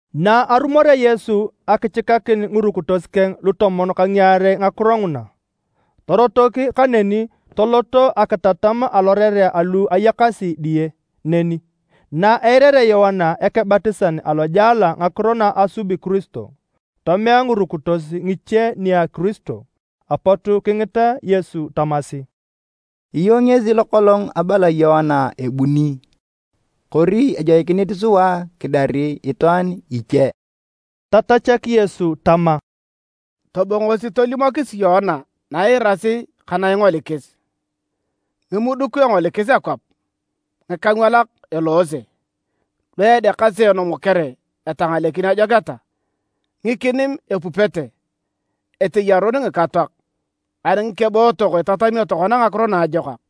Na arumorea Yesu akichikakin ngirukitos keng lutomon ka ngiarei ngakiro nguna, torotok kaneni tolot akitatam alorerea alu ayakasi diye neni. Na eirarea Yoana Ekebatisan alojela ngakiro na asubi Kiristo, tomea ngirukitos ngiche nia Kiristo. Apot kingita Yesu tamasi, “Iyong ngesi lokolong abala Yoana ebuni kori ejoikinit sua kidari itwaan iche?” Tatachak Yesu tama, “Tobongosi tolimokisi Yoana na iirasi ka na ingolikis. Ngimuduk engolikis akwap, ngikangwalak eloose, lu edeakasi enomokere etangalekin ajoketa, ngikinim epupete, eteyarun ngikatoak, ani ngikebootok itatamio tokona Ngakiro Naajokak.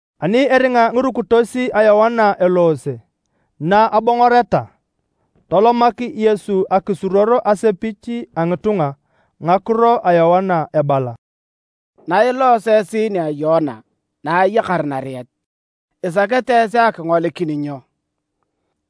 Ani eringa ngirukitos a Yoana eloose na abongoreta, tolomak Yesu akisiruor asepich a ngitunga ngakiro a Yoana ebala, “Nailooso esi nia Yoana na ayakar nariet, isakete esi akingolikin nyo?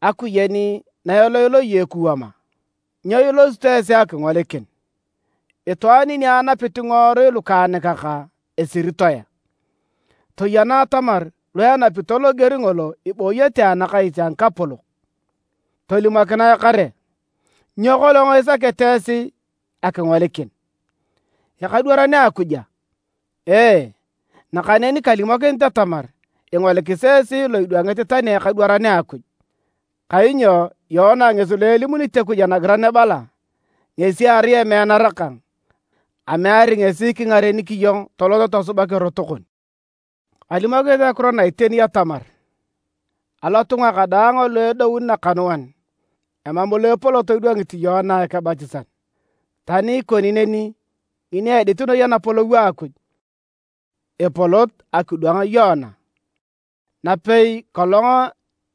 Akuyen na eloiloi ekuwam a? Nyo ilosito esi akingolikin? Itwaan ni anapit ngiworui lukaanikak esiritoe a? Toyena atamar lu enapito loger ngolo ibooyete anakais a ngikapolok. Tolimokinae kare, nyo kolong isakete esi akingolikin? Ekadwaran a Akuj a? Ee, nakaneni kalimokinit atamar ingolikis esi lo idwangit tani ekadwaran a Akuj. Kainyo Yoana ngesi lo elimunit Akuj anagiran ebala: ‘Ngesi erai emeanara kang, ameari ngesi kingarenik iyong tolot tosubak erot kon.’ Kalimokinit ngakiro na iteni atamar, alotunga kadaang alu edoun nakanuan, emam lo epolot idwangit Yoana Ekebatisan. Tani ikoni neni, ngini edit noi apolou a Akuj, epolot akidwang Yoana. Napei kolong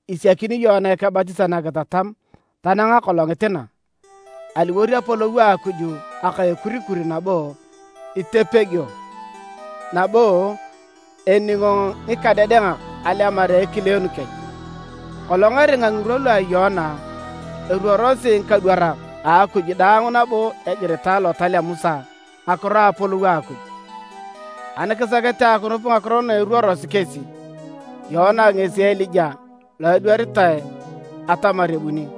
isiakini Yoana Ekebatisan akitatam tanang akolongit na, aliwor apolou a Akuj aka a ekurikur nabo itepegio, nabo eningo ngikadedengak alemar a ekileenu kech. Kolong eringa ngirwa lu a Yoana, eruorosi ngikadwarak a Akuj daang nabo egiritae Lotal a Musa ngakiro a apolou a Akuj. Ani kisakete akinup ngakiro na eruorosi kesi, Yoana ngesi Elija lo adwaritae atamar ebuni.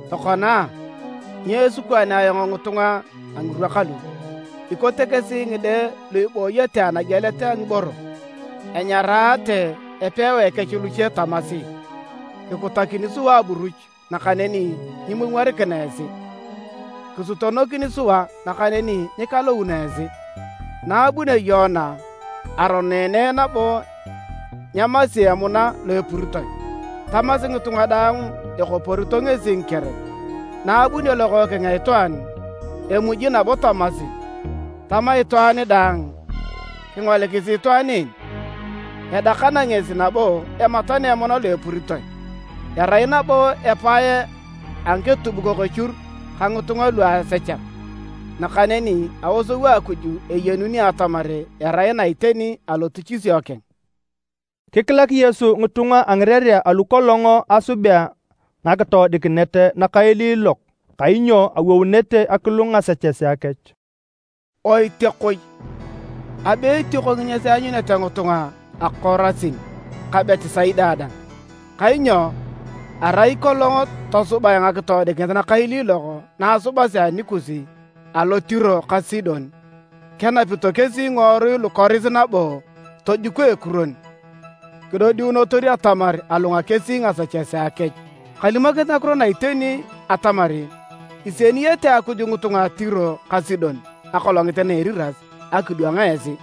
“Tokona, nyo esikwaanea ayong ngitunga a ngirwa kalu? Ikote kesi ngide lu ibooyete anagielet a ngiboro. Enyaraate epewae kech luche tamasi, ‘Kikutakini sua aburuch, nakaneni nyimwomworikina esi. Kisutonokini sua nakaneni nyikalouno esi’. Na abunio Yoana, aroneene nabo nyeemasi emuna lo epuritoe, tamasi ngitunga daang ekoporito ngesi ngikerep. Na abunio Lokookeng a Itwaan, emuji nabo tamasi, tama itwaan daang, ‘Kingolikisi itwaan en! Edakana ngesi nabo ematana emuna lo epuritoe, erai nabo epae a ngiketubukok echur ka ngitunga luasechak’. Nakaneni aosou a Akuj eyenunio atamar erai na iteni alotichisio keng.” Kikilak Yesu ngitunga a ngirerea alu kolong asubea ngakitoodikinet nakailiilok kainyo awounete akilung ngasechesea kech. “Oitiakoi! Abe etioko nginyas eanyunete ngitunga a Korasin ka Betisaida dang! Kainyo arai kolong tosubae ngakitoodikinet nakailiilok na asubasi anikus alo Tiro ka Sidon, kenapito kesi ngiworui lukoris nabo tojuko ekuron kidodiunotor atamar alunga kesi ngasechesea kech. Kalimokinit ngakiro na iteni atamar isieniyete Akuj ngitunga a Tiro ka Sidon akolongit na a Eriras akidwang esi.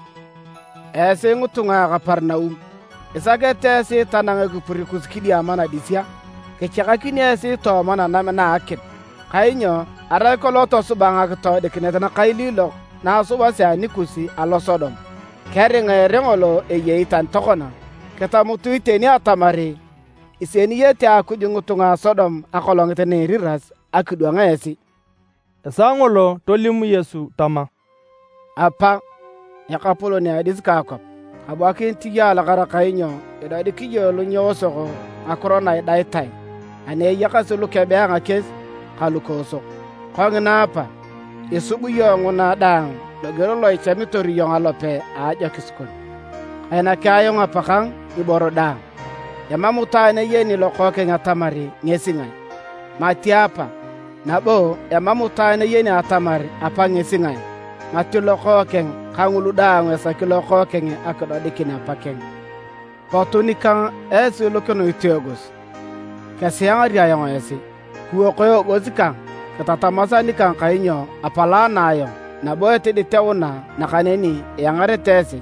Esi ngitunga a Kaperinaum! Isakete esi tanang ekipur kus kidiama nadis a? Kichakakinio esi tooma nanam na a akim. Kainyo arai kolong tosubae ngakitoodikinet nakailiilok na asubasi anikus alo Sodom, keringa ere ngolo eyei tani tokona. Kitamutu iteni atamar isieniyete Akuj ngitunga a Sodom akolongit na a Eriras akidwang esi!” Esaa ngolo tolim Yesu tama, “Apa, Ekapolon a adis ka kwap. Kabuakinit iyong alakara kainyo idodik iyong lu nyeosok ngakiro na idaitae ani eyakasi lukebe a ngakies ka lukoosok. Kongina Apa, isub iyong nguna daang loger lo ichamitor iyong alope a ajokis kon. Kainaki ayong Apakang ngiboro daang. Emam itwaan eyeni Lokookeng atamar ngesi ngae, mati Apa, nabo emam itwaan eyeni atamar Apa ngesi ngae mati Lokookeng kangulu daang esaki Lokookeng akidodikin Apakeng. “Potu nikang esi daang lu kinuit eegos, kesiangari ayong esi. Kiwoko eegos kang, kitatamas anikang kainyo apalaana ayong nabo etiditeuna nakaneni iangarete esi.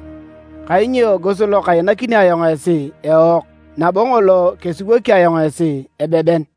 Kainyo eegos lo kainakini ayong esi eook, nabo ngolo kesiwoki ayong esi, ebeben.”